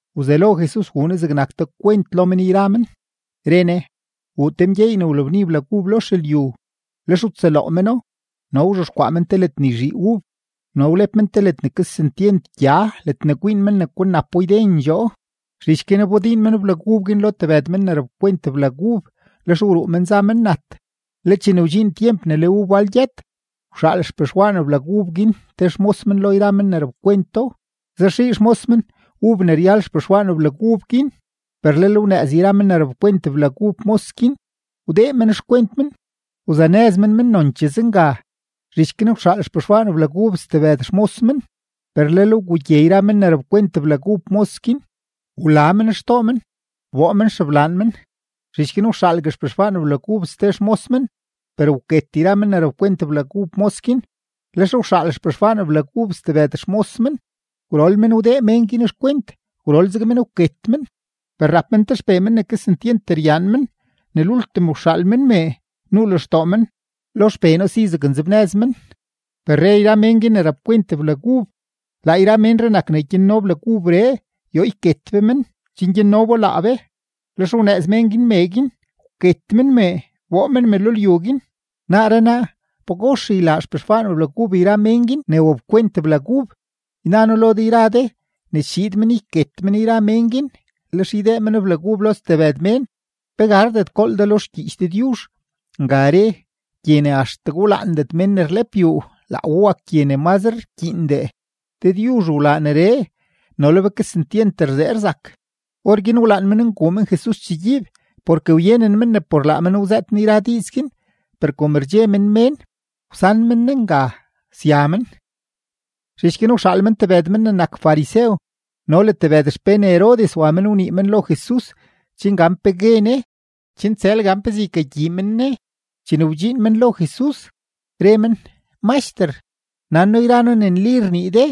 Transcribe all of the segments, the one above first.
Wzelo Jesus wuu Ne zegnak te kwent lo men yra men, re Ne: ―Wuu te mgyeey ne wlabni blag ub lo xelyu, lex wtsëloo meno, no wzhexkwaa men te ledne yzhii ub, no wlep men te ne kesentyent gya ledne kwiin men ne ykanapo ydendxoo. ’Zhich guin wbodiin men blag ub guin lo tebëd mén ne rapkwent blag ub. Lex wruu men za men nat. Le chene wdxiin tyemp ne le ub wal gyët, wxaal xpexwaan blag ub guin te xmos men lo yra men ne rapkwento, zaxii xmos men ub ne ryal xpexwaan blag ub guin. Per lel wnëëz yra men ne rapkwent blag ub mos guin, wdee men xkwent men, wzanëz men men nonchee zenga. Zhich guin wxaal xpexwaan blag ub ste xmos men, per lel wgugye yra men ne rapkwent blag ub mos guin, wla men xtoo men, wboo men xeblaan men. Zhich guin wxaalgue xpexwaan blag ub ste xmos men, per wket yra men ne rapkwent blag ub mos guin. Lex wxaal xpexwaan blag ub stebëd xmos men; gwrol men wdee mén guin xkwent, gwrol zeg men wket men. ’Per rap men te xpee men ne kesentyent ryaan men. Ne lultim wxaal men mee, nuu lextoo men: “Lo xpee noo si zaknzebnëz men.” Per re yra mén guin ne rapkwent blag ub: “Laa ménree nak ne gyanno blag ubree; yoo yket be men, chen gyanno bo laa be.” Lex wnëëz yra mén guin mee guin, wket men mee, wboo men me lo lyu guin. ’Naaree naa, ¿pagox ylaa xpexwaan blag ub yra mén guin ne wapkwent blag ub? Yna noo lo de ne chiid men yket men yra mén guin, lex ydee men blag ub lo stebëd mén. ’¿Pe gardet gool de lo xgyiich Dëdyuzh? Nga re: Gye ne axtegue rlaandet mén ne rlep yuu, laa we wak gye ne mazre rkyiindee. Dëdyuzh wlaa neree, no le be kesentyent rzee rzak. Orguin wlaan men nguu men Jesus chegyiib, porke wyenen men ne por laa men wzëët Ne yra diiz guin. Per kom rdxe men mén, wsan men Ne nga, sya men. Zhich guin wxaal men tebëd men ne nak farisew no le tebëd xpén Herodes wa wanii lo Jesus chen gan pe gue Ne chen tsël gan pezee ykagyii men Ne. Chene wdxiin men lo Jesus, re men: ―Maxter, nan noo yra noo ne nli ne rnii de,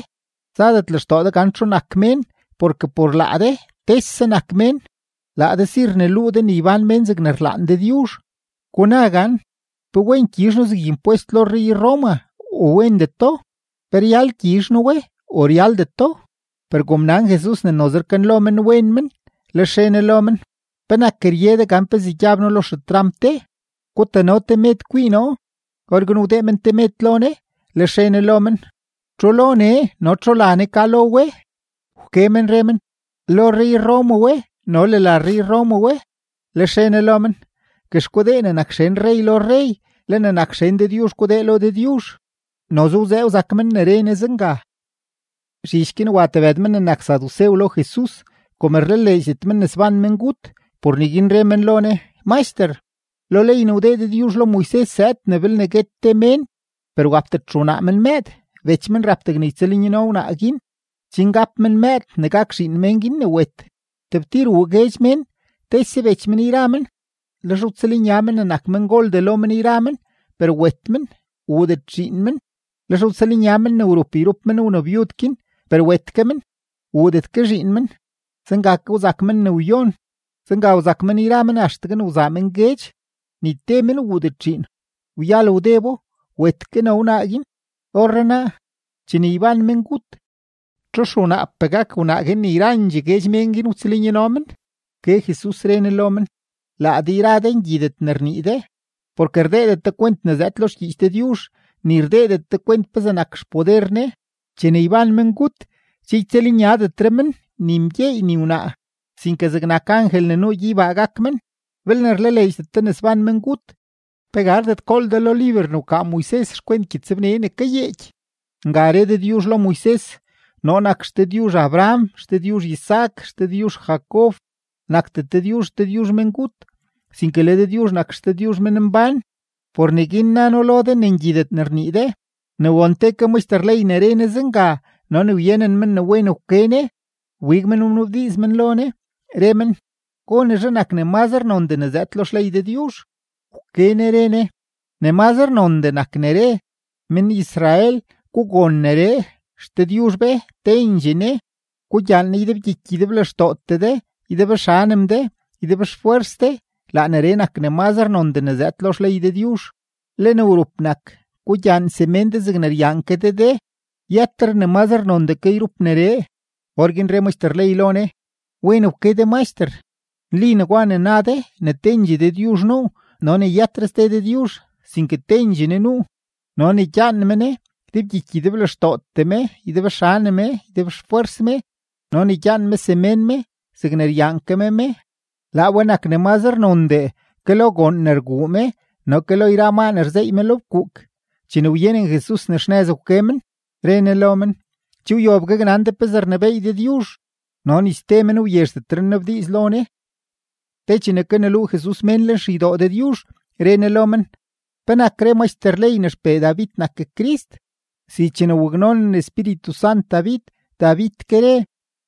zadet lextoo de gan txu nak mén porke por laa de tese nak mén. Laa de si rneluu de ne ybán mén zegne rlaan Dëdyuzh. Guna gan ¿pe wen gyizh noo zeg impwest lo rrey-Roma u wendeto? ¿Pe ryal gyizh noo we u ryaldeto? Per kom nan Jesus ne noze rkanlo men wen men, lex re Ne lo men: ―¿Penak rye de gan pezee gyab noo lo xetramp de? Gutano te med kwii noo. Orguin wdee men te med lo Ne; lex re Ne lo men: ―¿Txu lo nee no txu la nee ka lo we? Wke men re men: ―Lo rrey-Roma we no le la rrey-Roma we. Lex re Ne lo men: ―Guex gudee ne nak xen rrey lo rrey, le ne nak xen Dëdyuzh gudee lo Dëdyuzh. Noze wzee wzak men ne re Ne zenga. Zhich guin wa tebëd men ne nak sadusew lo Jesus. Kom rlaleedxdet men ne sban mengut, por neguin re men lo Ne: ―Maxter, lo ley ne wdee Dëdyuzh lo Moises zëëd ne belne guet te mén, per wapdet xewnaa men mëëd, bech men rap degne ytsëlnyano wnaa guin, chen gap men mëëd ne gak zegnak zhiin mén guin ne wet. Tebtir wuu guedx mén, tese bech men yra men; lex wtsëlnya men ne nak mengoldee lo men yra men, per wet men; wuudet zhiin men. Lex wtsëlnya men ne wrup yrup men wnabyud guin per wet ke men; wuudet ke zhiin men. Zenga ke wzak men ne wyon. Zenga wzak men yra men axtegue wzaa men guedx; ni te men wuudet zhiin. Wyal wdebo, wet ke no wnaa guin. Orrenaa, chene yban mengut, ¿txu xewnaapee gak wnaa guin ne yrandxee guedx mén guin wtsëlnyano men? Wke Jesus, re Ne lo men: ―Laa de yra de ngyidet ne rnii de, porke rdeedet de kwent ne zëëd lo xgyiich Dëdyuzh, ni rdeedet de kwent pezee nak xpoder Ne. Chene yban mengut, che ytsëlnyadetre men, ni mgyeey ni wnaa, sinke zegnak angel ne nuu gyeybaa gak men. Belne rlaleedxdet de ne sban mengut, ¿pe gardet gool de lo liber ne wkaa Moises xkwent gyëtsbne ne kayeeky? Nga re Dëdyuzh lo Moises: “Noo nak XDëdyuzh Abraham, XDëdyuzh Isaac, XDëdyuzh Jacob.” Nakdet Dëdyuzh XDëdyuzh mengut, sinke le Dëdyuzh nak XDëdyuzh menmbán. Por neguin na noo lo de ne ngyidet ne rnii de. Ne won te ke maxter ley ne re Jesus zenga no ne wyenen men ne wen wke Ne, wbig men wnabdiiz men lo Ne, re men: ―¿Gonezhe nak ne mazre nondee ne zëëd lo xley Dëdyuzh? Wke Ne re Ne: ―Ne mazre nondee nak ne re: “Men-Israel, gugon neree; XDëdyuzh be, tendxee Ne; gugyaan Ne ydebgyiky ydeblextootee de, ydebxanem de, ydebxfwers de.” Laa neree nak ne mazre nondee ne zëëd lo xley Dëdyuzh. Le ne wrup nak: “Gugyaan semén de zegne ryaan ke de de.” Yëtre ne mazre nondee ke lo yrup neree. Orguin re maxter ley lo Ne: ―Wen wke de Maxter. Nli negwa ne na de, ne tendxee Dëdyuzh nuu no ne yëtre ste Dëdyuzh, sinke tendxee Ne nuu. No ne gyaan me Ne ydebgyiky ydeblextootee me, ydebxanem me, ydebxfwers me, no ne gyaan me semén me zegne ryaan ke me me, laa we nak ne mazre nondee ke lo goon ne rguu me no ke lo yra maa ne rzeey me lo fkuuk. Chene wyenen Jesus ne xnëz wke men, re Ne lo men: ―Che wyob gaknan de pezee rnebééy Dëdyuzh. No ni ste men wyezhdetre nnabdiiz lo Ne. Te chene kaneluu Jesus mén lenxeydoo Dëdyuzh, re Ne lo men: ―¿Penak re maxter ley ne xpee David nak Crist? Si chene waknonen Espíritu Sant David, David ke re: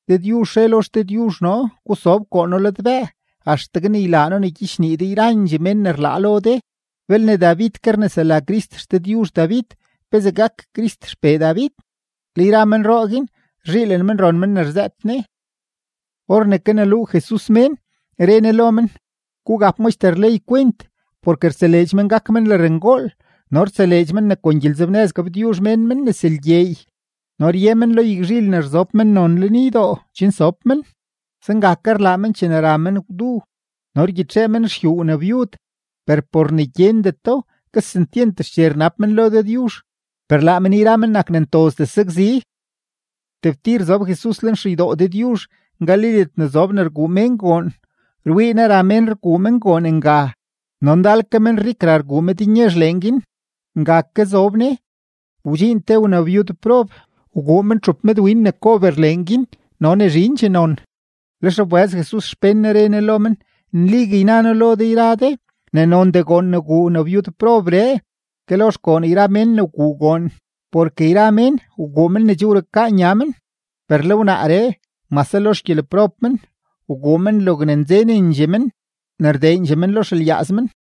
Dëdyuzh re lo XDëdyuzh noo: “Gusob koo noo ladbëë axtegue ne ylaa noo ne gyichnii de yrandxee mén ne rlaa lo de.” Belne David ke rnesela Crist XDëdyuzh David, ¿pezee gak Crist xpee David? Le yra menroo guin, rzhiilen men ron men ne rzëët Ne. Or ne kaneluu Jesus mén, re Ne lo men: ―Gugap maxter ley kwent, porke rtseleedx men gak men lërngool, no rtseleedx men ne kon gyelenzebnëz gabtyuzh mén men nes lgyeey, no rye men lo yagzhil ne rzob mennon lenydoo chen sob men; zenga ke rlaa men chene ra men gwdu, no rgyitxee men xyuu wnabyud, per por ne gyendeto, kesentyent xche rnab men lo Dëdyuzh, per laa men yra men nak ne ntozdee sakzi. Tebtir zob Jesus lenxeydoo Dëdyuzh ngali ledne zob ne rguu mén goon, rwii Ne ra mén rguu men goon nga, no ndal ke menrik ra rguu mednyezh leen guin. Nga ke zob Ne, wdxiin te wnabyudprob, wguu men txup medwin ne kober leen guin no ne zhindxee non. Lex wbëz Jesus xpén Ne, re Ne lo men: ―Nligue yna noo lo de ne nondee goon ne wguu wnabyudprobree ke lo xgoon yra mén ne wguu goon. Porke yra mén wguu men ne che wrukaa nya men, per le wnaaree mase lo xgyeleprob men, wguu men logne nzenendxee men ne rdeendxee men lo xelyaaz men.